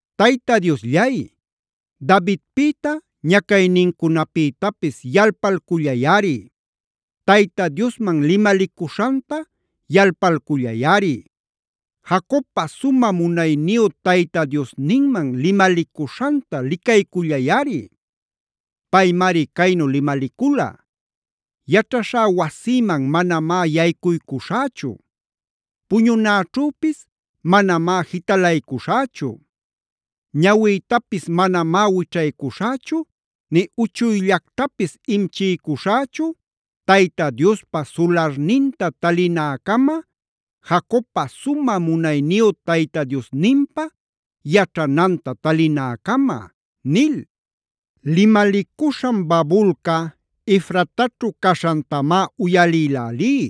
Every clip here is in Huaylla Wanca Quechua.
Tayta Diosllay, Davidpïta ñacaynincunapïtapis yalpalcullayꞌari. Tayta Diosman limalicuśhanta yalpalcullayꞌari. Jacobpa sumä munayniyu Tayta Diosninman limalicuśhanta licaycullayꞌari. Paymari caynu limalicula: “Yaćhaśhá wasïman manamá yaycuycuśhächu. Puñunäćhüpis manamá jitalaycuśhächu. Ñawïtapis manamá wićhaycuśhächu nï uchuyllactapis imchiycuśhächu, Tayta Diospä sularninta talinäcama, Jacobpa sumä munayniyu Tayta Diosninpä yaćhananta talinäcama” nil. Limalicuśhan babulca Efrataćhu caśhantamá uyalïlälí.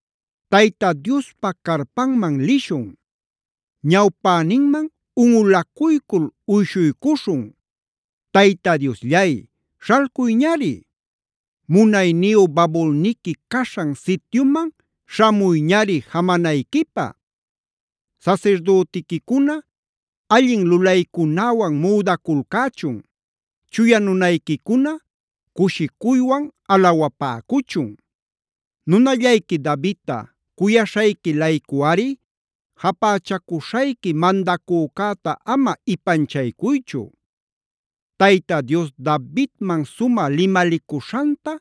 ¡Tayta Diospa carpanman lishun! ¡Ñawpäninman unꞌulacuycul uyshuycuśhun! Tayta Diosllay, śhalcuyñari. Munayniyu babulniqui caśhan sityuman śhamuyñari jamanayquipä. Sasirdütiquicuna allin lulaycunäwan müdaculcächun. Chuya nunayquicuna cushicuywan alawapäcuchun. Nunallayqui Davidta cuyaśhayqui-laycuꞌari japächacuśhayqui mandacücäta ama ipanchaycuychu. Tayta Dios Davidman sumä limalicuśhanta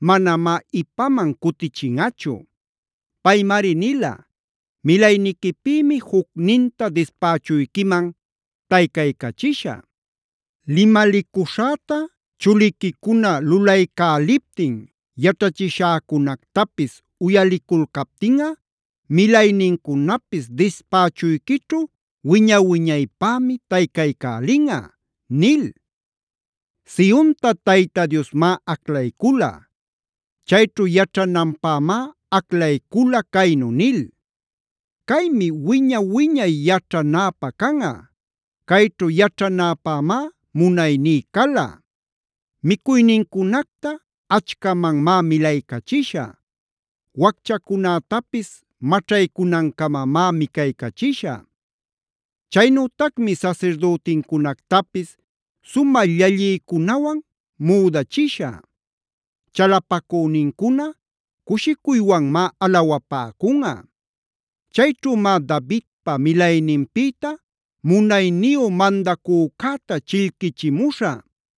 manamá ipaman cutichinꞌachu.b Paymari nila: “Milayniquipïmi jucninta dispächuyquiman taycaycachishä. Limalicuśhäta chuliquicuna lulaycäliptin, yaćhachiśhäcunactapis uyaliculcaptinꞌa milaynincunapis dispächuyquićhu wiña-wiñaypämi taycaycälinꞌa” nil. Sionta Tayta Diosmá aclaycula. Chayćhu yaćhananpämá aclaycula caynu nil: “Caymi wiña-wiñay yaćhanäpä canꞌa. Cayćhu yaćhanäpämá munayní cala. Micuynincunacta achcamanmá milaycachishä. Wacchacunätapis maćhaycunancamamá micaycachishä. Chaynütacmi sasirdütincunactapis sumä llalliycunawan müdachishä. Chalapacünincuna cushicuywanmá alawapäcunꞌa. Chayćhümá Davidpa milayninpïta munayniyu mandacücäta chillquichimuśhä.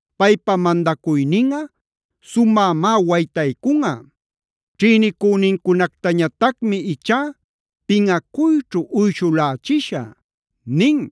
Paypa mandacuyninꞌa sumämá waytaycunꞌa. Ćhïnicünincunactañatacmi ichá pinꞌacuyćhu uyshulächishä” nin.